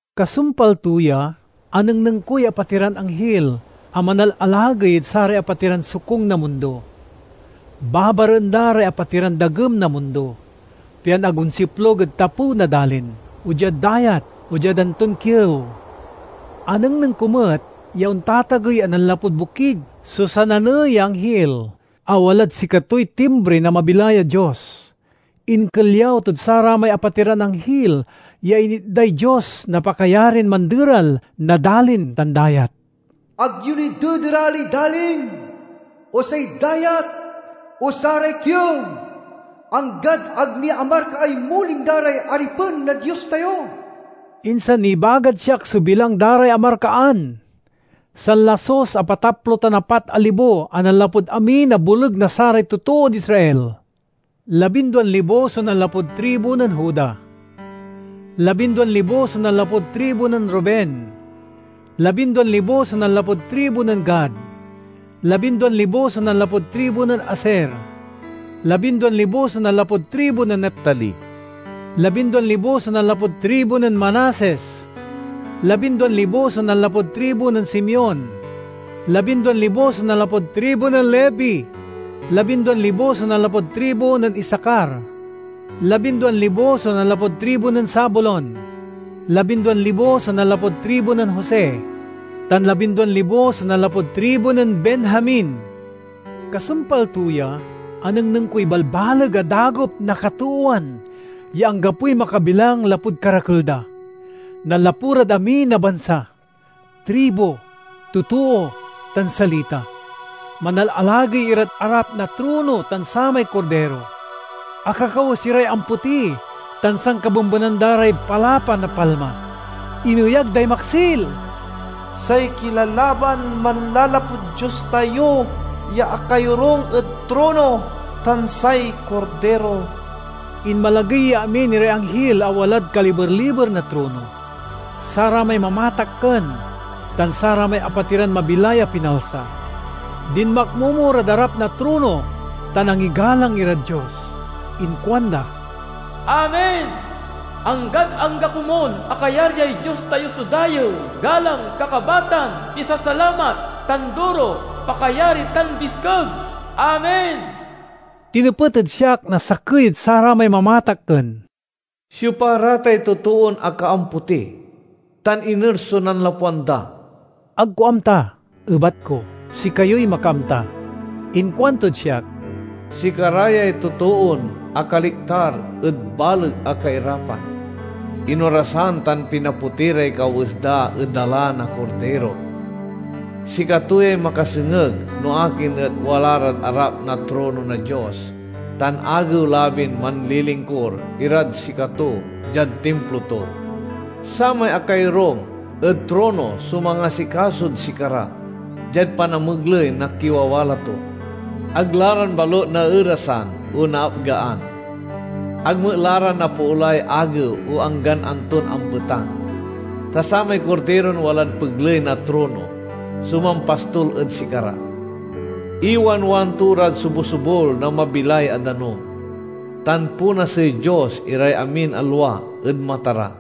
Kasumpal to ya, anengneng koy apatiran anghil a manalalagey ed saray apatiran sokung na mundo. Babaraen da ray apatiran dagem na mundo, pian ag onsiplug ed tapew na dalin, o diad dayat, o diad anton kiew. Anengneng ko met ya ontatagey a nanlapud bokig so sananey ya anghil a walad sikatoy timbri na mabilay a Dios. Inkelyaw tod saramay apatiran anghil ya initday Dios na pakayarin manderal na dalin tan dayat, "Ag yo ni dederaley dalin, o say dayat, o saray kiew, anggad ag ni amarkaay muling da ray aripen na Dios tayo." Insan nibagad siak so bilang da ray amarkaan: sanlasus, apataplo tan apat a libo a nanlapud amin a boleg na saray totood Israel. Labinduan libo so nanlapud tribu nen Juda; labinduan libo so nanlapud tribu nen Ruben, labinduan libo so nanlapud tribu nen Gad; labinduan libo so nanlapud tribu nen Aser; labinduan libo so nanlapud tribu nen Neftali; labinduan libo so nanlapud tribu nen Manases; labinduan libo so nanlapud tribu nen Simeon; labinduan libo so nanlapud tribu nen Levi; labinduan libo so nanlapud tribu nen Isacar; labinduan libo so nanlapud tribu nen Zabulon; labinduan libo so nanlapud tribu nen Jose; tan labinduan libo so nanlapud tribu nen Benjamin. Kasumpal to ya, anengneng koy balbaleg a dagop na katoowan ya anggapoy makabilang lapud karakel da. Nanlapu rad amin a bansa, tribu, totoo, tan salita. Manalalagey irad arap na trono tan samay Kordiro. Akakawes iray ampoti tan sankabembenan da ray palapa na palma. Ineyag day maksil, "Say kilalaban manlalapud Dios tayo ya akayorung ed trono, tan say Kordiro!" Inmalagey ya amin iray anghil a walad kaliber-liber na trono, saramay mamatakken, tan saramay apatiran mabilay a pinalsa. Dinmakmomo rad arap na trono tan angigalang irad Dios. Inkuanda, "Amen! Anggad angga komun a kayaryay Dios tayo so dayew, galang, kakabatan, pisasalamat, tanduro, pakayari, tan biskeg! Amen!" Tinepet ed siak na sakey ed saramay mamatakken, "Siopa ra tay totoon akaampoti, tan iner so nanlapwan da?" "Ag ko amta," ebat ko. "Sikayoy makaamta." Inkuantod siak, "Sikara yay totoon akaliktar ed baleg a kairapan. Inorasan tan pinapoti ray kawes da ed dala na Kordiro. Sikato yay makasengeg no akin et wala rad arap na trono na Dios tan agew-labin manlilingkur irad sikato diad timplo to. Samay akayorung ed trono so mangasikasod sikara, diad panamegley na kiwawala to. Ag la ran balut naerasan o naapgaan. Ag met la ra napoolay agew o anggan anton ampetang. Ta samay Kordiron walad pegley na trono so mampastol ed sikara. Iwanwan to rad sobusobul na mabilay a danum, tan ponasey Dios iray amin a lua ed mata ra."